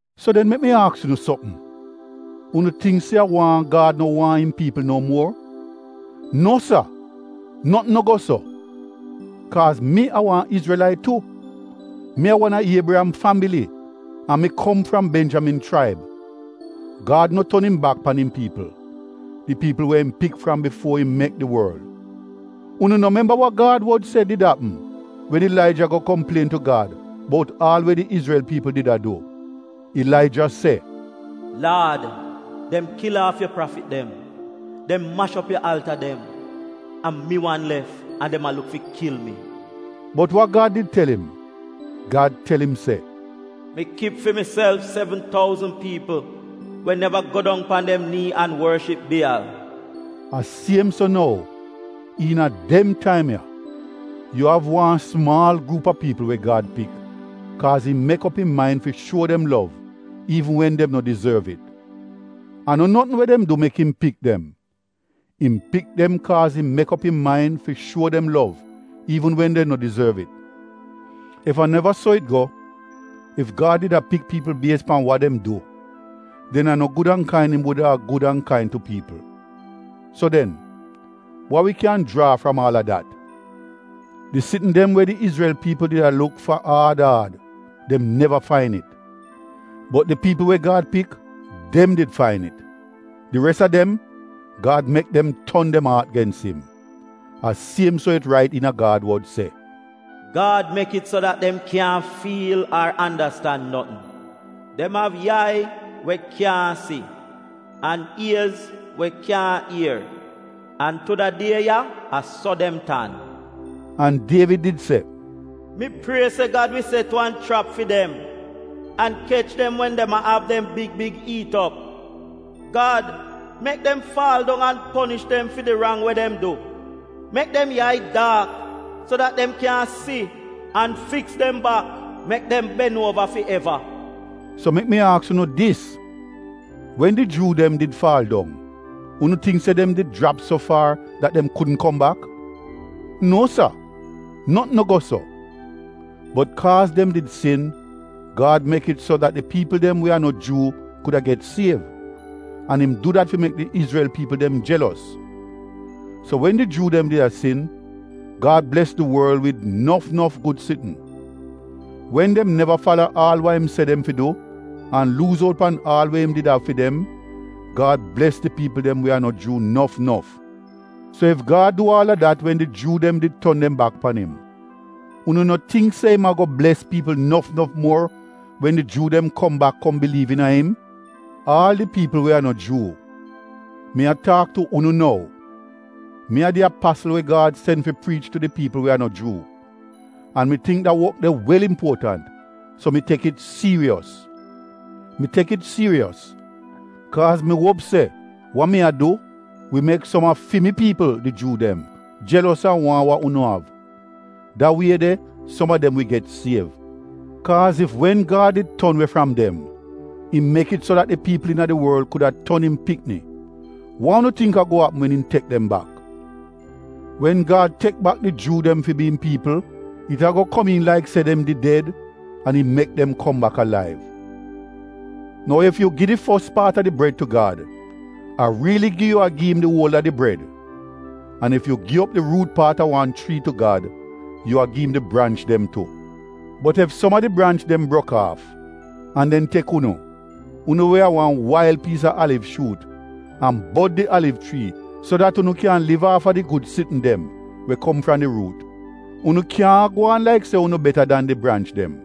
So den mek mi aks unu sopm, unu tingk se a waahn Gad no waahn im piipl no muor? No sa! Notn no go so! Kaaz mi a wan Izrelait tu, mi a wan a Iebriyam fambili an mi kom fram Benjamin chraib. Gad no ton im bak pan im piipl — di piipl we im pik fram bifuo im mek di worl! Unu no memba wa Gad wod se did apm wen Ilaija go komplien tu Gad bout aal we di Izrel piipl did a du? Ilaija se, “Laad, dem kil aaf yu prafit dem, dem mash op yu alta dem; a mi wan lef an dem a luk fi kil mi!” Bot wa Gad did tel im? Gad tel im se “Mi kip fi miself, sevn touzn piipl we neva go dong pan dem nii an worship Bieyal.” A siem so nou, iina dem taim ya, yu av wan sumaal gruup a piipl we Gad pik kaaz im mek op im main fi shuo dem lov iivn wen dem no dizorv it. A no notn we dem du mek im pik dem, im pik dem kaaz im mek op im main fi shuo dem lov iivn wen dem no dizorv it. Ef a neva so it go, ef Gad did a pik piipl bies pan wa dem du, den a no gud an kain im wuda a gud an kain tu piipl. So den, wa wi kyan jraa fram aal a dat? Di sitn dem we di Izrel piipl did a luk fa aad aad, dem neva fain it, bot di piipl we Gad pik, dem did fain it. Di res a dem, Gad mek dem ton dem aat gens im. A siem so it rait iina Gad wod se, “Gad mek it so dat dem kyaahn fiil ar andastan notn; dem av yai we kyaahn si an iez we kyaahn ier, an tu da die ya a so dem tan.” An Dievid did se, “Mi prie se Gad wi set wan chrap fi dem an kech dem wen dem a av dem big big iit op. Gad, mek dem faal dong an ponish dem fi di rang we dem du; mek dem yai daak so dat dem kyaahn si an fiks dem bak mek dem ben uova fi eva.” So mek mi aks unu dis: wen di Juu dem did faal dong, unu tingk se dem did jrap so faar dat dem kudn kom bak? Nuo sa, notn no go so! Bot kaaz dem did sin, Gad mek it so dat di piipl dem we a no Juu kuda get siev, an im du dat fi mek di Izrel piipl dem jelos. So, wen di Juu dem did a sin, Gad bles di worl wid nof nof gud sitn. Wen dem neva fala wa im se dem fi du an luuz out pan aal we im did av fi dem, Gad bles di piipl dem we a no Juu nof nof. So ef Gad du aal a dat wen di Juu dem did ton dem bak pan im, unu no tingk se im ago bles piipl nof nof muor wen di Juu dem kom bak kom biliiv iina im? Aal di piipl we a no Juu, mi a taak tu unu nou: mi a di apasl we Gad sen fi priich tu di piipl we a no Juu, an mi tingk da wok de wel impuotant, so mi tek it siiriyos. Mi tek it siiriyos kaaz mi uop se wa mi a du wi mek som a fi mi piipl, di Juu dem, jelos an waahn wa unu av, da wie de som a dem wi get siev. Kaaz ef wen Gad did ton we fram dem, im mek it so dat di piipl iina di worl kuda ton im pikni, wa unu tingk ago apm wen im tek dem bak? Wen Gad tek bak di Juu dem fi bi im piipl, it ago komiin laik se dem did ded an im mek dem kom bak alaiv. Nou ef yu gi di fos paat a di bred tu Gad, a riili gi yu a gi im di uol a di bred; an ef yu gi op di ruut paat a wan chrii tu Gad, yu a gi im di branch dem tu. Bot ef som a di branch dem brok aaf, an dem tek unu, unu we a wan wail piis a aliv shuut, an bod di aliv chrii so dat unu kyan liv aafa di gud sitn dem we kom fram di ruut, unu kyaahn a gwaan laik se unu beta dan di branch dem.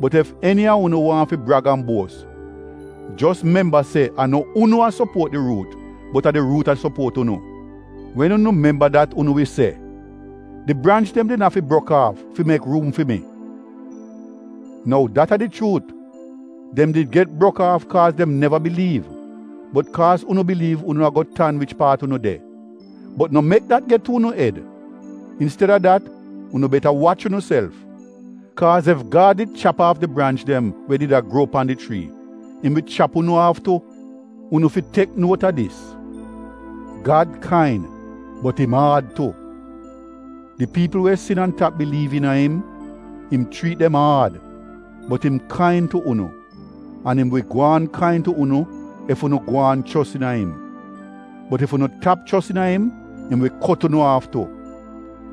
Bot ef eni a unu waahn fi brag an buos, jos memba se a no unu a sopuot di ruut bot a di ruut a sopuot unu. Wen unu memba dat unu wi se, “Di branch dem did afi brok aaf, fi mek ruum fi mi.” Nou dat a di chuut. Dem did get brok aaf kaaz dem neva biliiv bot kaaz unu biliiv unu ago tan wich paat unu de. Bot no mek dat get tu unu ed, insteda dat unu beta wach unuself! Kaaz ef Gad did chap aaf di branch dem we did a gruo pan di chrii, im wi chap unu aaf tu. Unu fi tek nuot a dis! Gad kain bot im aad tu. Di piipl we sin an tap biliiv iina im, im chriit dem aad, bot im kain tu unu, an im wi gwaan kain tu unu ef unu gwaan chos iina im. Bot ef unu tap chos iina im, im wi kot unu aaf tu.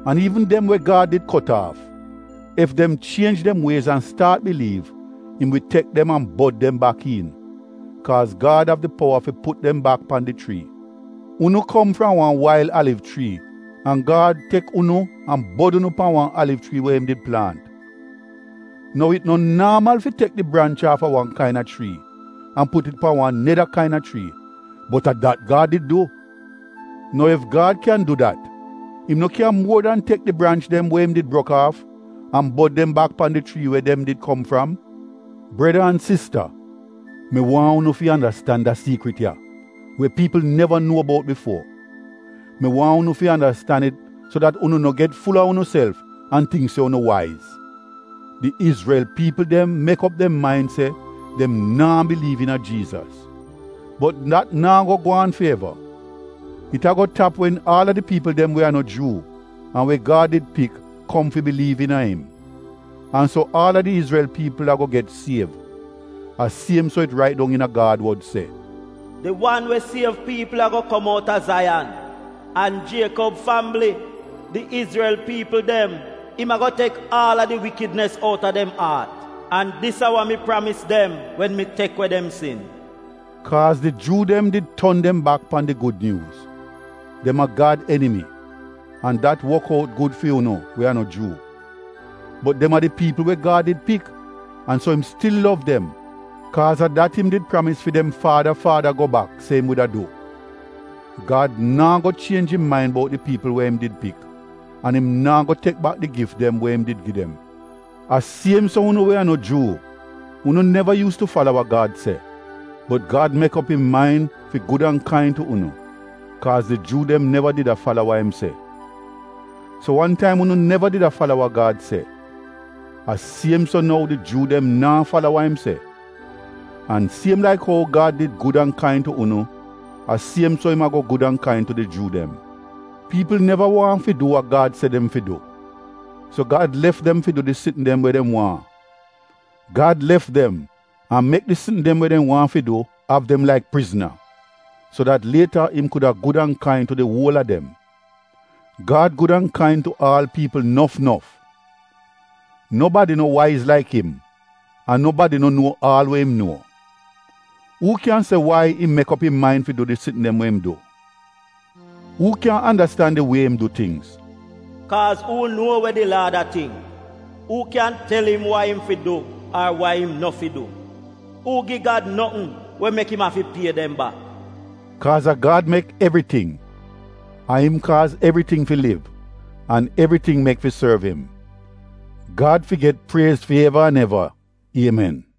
An iivn dem we Gad did kot aaf, ef dem chienj dem wiez an staat biliiv, im wi tek dem an bod dem bak iin, kaaz Gad av di powa fi put dem bak pan di chrii. Unu kom fram wan wail aliv chrii an Gad tek unu an bod unu pan wan aliv chrii we im did plaant. Nou it no naamal fi tek di branch aafa wan kaina chrii an put it pan wan neda kaina chrii bot a dat Gad did du. Nou ef Gad kyan du dat, im no kyan muor dan tek di branch dem we im did brok aaf an bod dem bak pan di chrii we dem did kom fram? Breda an sista mi waahn unu fi andastan da siikrit ya we piipl neva nuo bout bifuo. Mi waahn unu fi andastan it so dat unu no get ful-a unuself an tingk se unu waiz: Di Izrel piipl dem mek op dem main se dem naa biliiv iina Jiizas, bot dat naa go gwaan fi eva. It ago tap wen aal a di piipl dem we a no Juu an we Gad did pik kom fi biliiv iina im. An so aal a di Izrel piipl ago get siev, a siem so it rait dong iina Gad wod se: “Di wan we siev piipl ago kom outa Zaiyan; An Jiekob fambili, di Izrel piipl, im ago tek aal a di wikidnis out a dem aat. An dis a wa mi pramis dem wen mi tek we dem sin.” Kaaz di Juu dem did ton dem bak pan di Gud Nyuuz, dem a Gad enimi, an dat wok out gud fi unu we a no Juu. Bot dem a di piipl we Gad did pik an so im stil lov dem kaaz a dat im did pramis fi dem faada faada go bak se im wuda du. Gad naa go chienj im main bout di piipl we im did pik an im naa go tek bak di gif dem we im gi dem. A siem so unu we a no Juu, unu neva yuus tu fala wa Gad se, bot Gad mek op im main fi gud an kain tu unu kaaz di Juu dem neva did a fala wa im se. So wan taim unu neva did a fala wa Gad se, a siem so nou di Juu dem naa fala wa im se, an siem laik ou Gad did gud an kain tu unu a siem so im ago gud an kain tu di Juu dem. Piipl neva waahn fi du wa Gad se dem fi du. So Gad lef dem fi du di sitn dem we dem waahn. Gad lef dem an mek di sitn dem we dem waahn fi du av dem laik prizna, so dat lieta im kuda gud an kain tu di uol a dem. Gad gud an kain tu aal piipl nof nof! Nobadi no waiz laik im an nobadi no nuo aal we im nuo. Uu kyan se wai im mek op im main fi du di sitn dem we im du? Uu kyan andastan di wie im du tingz? Kaaz “Uu nuo wa di Laad a tingk? Uu kyan tel im wa im fi du ar wa im no fi du? Uu gi Gad notn we mek im afi pie dem bak?” Kaaz a Gad mek evriting! A im kaaz evriting fi liv an evriting mek fi sorv im. Gad fi get priez fi eva an eva! Iemen!